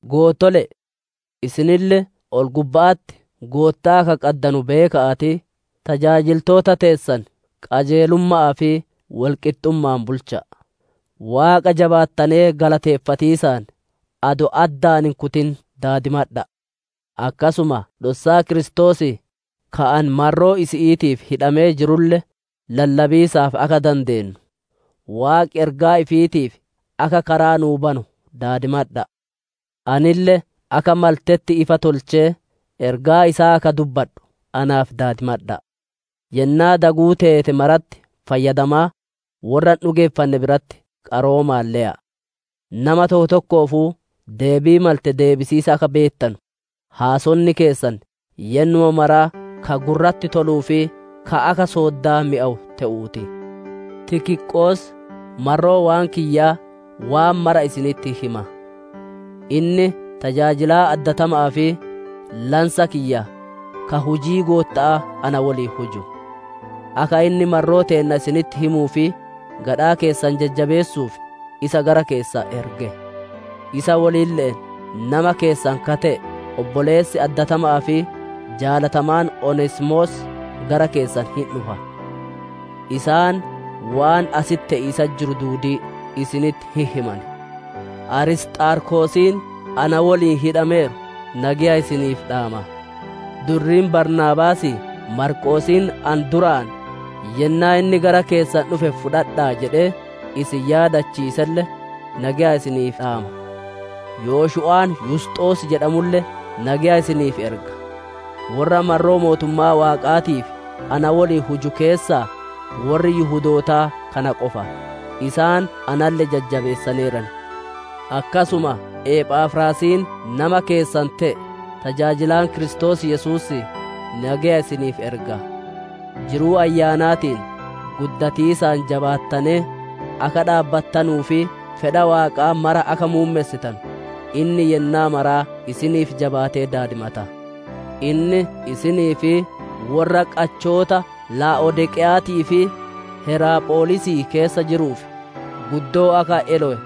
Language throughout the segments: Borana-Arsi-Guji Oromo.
Goottole'e! Isinille ol-gubba'atti Goottaa akka qaddanu beeka'aatii, tajaajiltoota teessan qajeelumma'aa fi wol qixxumma'aan bulcha'a. Waaqa jabaattanee galateeffatiisaan, adoo addaan hin kutin daadimadha'a. Akkasuma dhossaa Kiristoosii, ka ani marroo isi'iitiif hidhamee jirulle lallabiisaaf akka dandeennu, Waaqi ergaa ifiitiif akka karaa nuu banu daadimadha'a. Anille akka maltetti ifa tolchee ergaa isaa akka dubbadhu naaf daadimadha'a. Yennaa daguu teete maratti fayyadamaa, worra hin dhugeeffanne biratti qaroomaan le'a. Nama tokko tokkoofuu deebii malte deebisiisa akka beettanu, haasonni keessan yennuma maraa ka gurratti toluu fi ka akka sooddaa mi'awu te'uu ti. Tikiqoos, marroo waan kiyyaa waan mara isinitti hin hima; inni tajaajilaa addatama'aa fi lansa kiyya ka hujii Gootta'aa na woliin huju. Akka inni marroo teenna isinitti himuu fi gadhaa keessan jajjabeessuuf, isa gara keessan erge. Isa wolille'een nama keessan ka te'e, obboleessi addatama'aa fi jaalatamaan Oneesimoos gara keessan hin dhufa; isaan waan asitti te'iisatti jiru duudii isinitti hin himan. Arisxaarkosiin na woliin hidhameeru nageya isiniif dhaama. Durriin Baarnaabaasii Maarqoosiin ani duraan, «Yennaa inni gara keessan dhufe fudhadha'a jedhee isin yaadachiiselle» nageya isiniif dhaama. Yoshu'aan Yusxos jedhamulle nageya isiniif erga; worra marroo mootummaa Waaqaatiif na woliin huju keessaa, worri Yihudootaa kana qofa; isaan analle jajjabeessaneeran. Akkasuma Ephafraasiin nama keessan te'e, tajaajilaan Kiristoos Yesuusii nageya isiniif erga; jiruu ayyaanaatiin guddatiisaan jabaattanee, akka dhaabbattanuu fi fedha Waaqaa mara akka muummessitanu, inni yennaa mara isiniif jabaatee daadimata. Inni isinii fi worra qachoota Laa'odiiqeya'aatii fi Heraapholisii keessa jiruuf guddoo akka elowe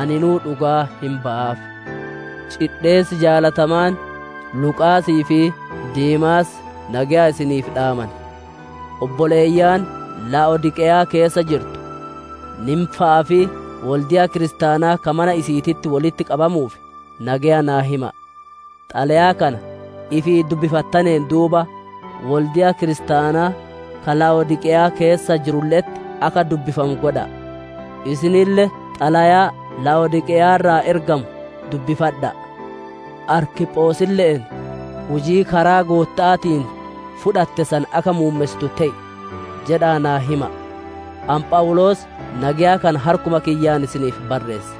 aninuu dhugaa hin bayaaf. Cidheessi jaalatamaan Luqaasii fi Deemaas nageya isiniif dhaaman. Obboleeyyan Laa'odiiqeyaa keessa jirtu Niimfa'aa fi wolde'a kiristaanaa ka mana isi'iititti wolitti qabamuuf nageya naa hima'a! Xalayaa kana ifii dubbifattaneen duuba, wolde'a kiristaanaa ka Laa'odiiqeyaa keessa jirulle'etti akka dubbifamu godha'a. Isinille xalayaa Laa'odiiqeyaa irraa ergamu dubbifadha'a. Arkiphosille'een, «Hujii karaa Gootta'aatiin fudhatte san akka muummessitu te'i» jedha'aa naa hima'a. Ani Phawuloos nageya kana harkuma kiyyaan isiniif barreesse;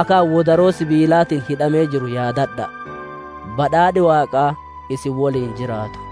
akka ani wodaroo sibiilaatiin hidhamee jiru yaadadha'a! Badhaadhi Waaqaa isin woliin jiraatu.